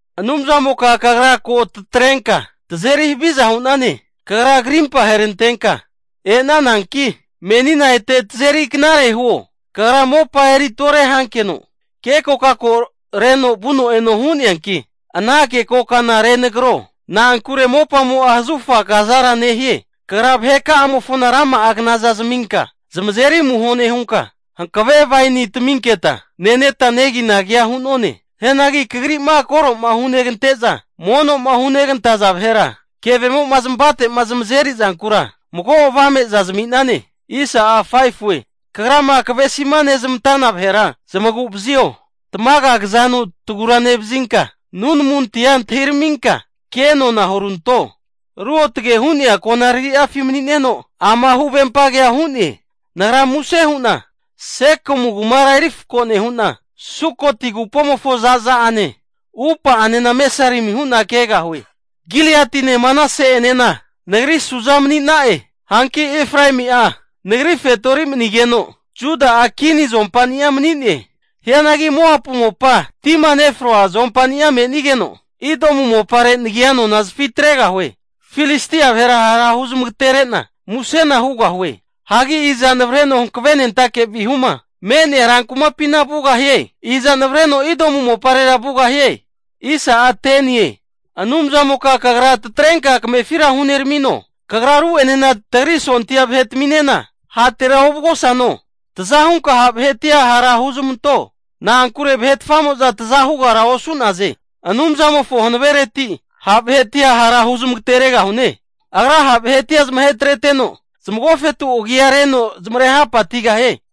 Anumzamoka, Kagra ko tatrenka tazeri haviza hu'nane. Kagra krimpa aherantenka e'nananki, menina ete tazeri knare huo! Kagra mopa eri tore hankeno, kekora reno vuno eno hu'neanki, ana kekokana renagro. Na'ankure mopamo'a zahufa kazara nehie. Kagra vaheka'amofona rama'a knaza zaminka zamazeri amuho nehunka, hankave waini taminketa neteta neginagia hu'none. Hianagi Kagri'ma koro'ma hugante'za, mono'ma hunegantaza vahera kevemo'ma zamavate'ma zamazeri zankura, mago avameza zami'nane. Kagrama kavesima nezmantana vahera zamagu'vazio. Tamaga kazanu taguranevazinka, nunamuntia antahiraminka kenona huranto. Ruotge hu'nea konarari'afi mani'neno, ama huvempa kea hu'ne. Nagra muse hu'na Sekemu kumara eri fako nehu'na, Sukoti agupomofo zaza'ane upa'anena mesarimi hu'na kegahue. Giliati'ene Manase'enena nagri suza mani'na'e. Hanki Efraemi'a Nagri fetori manigeno, Juda'a kini azompani'a mani'ne. Hianagi Moapu mopa tima nefroa zuompani'a me'nigeno, Edomu mopare nagia anona zafitregahue. Filistia vahera hara huzamagatere'na musena hugahue. Hagi iza navareno hankavenentake vihuma me'nea rankumapina vugahie? Iza navareno Edomu moparera vugahie? Anumzamoka Kagra tatrenka kamefira huneramino? Kagra ru'enena tagri sondia vahetaminena hatera ovugosano? Taza hunka ha' vahetia hara huzmanto, na'ankure vahetfamo'za taza hugara osu'naze. Anumzamofo hanavereti ha' vahetia hara huzmagateregahune. Agra ha' vahetia zamahetreteno, zamagofetu agia reno zamare hapatigahie.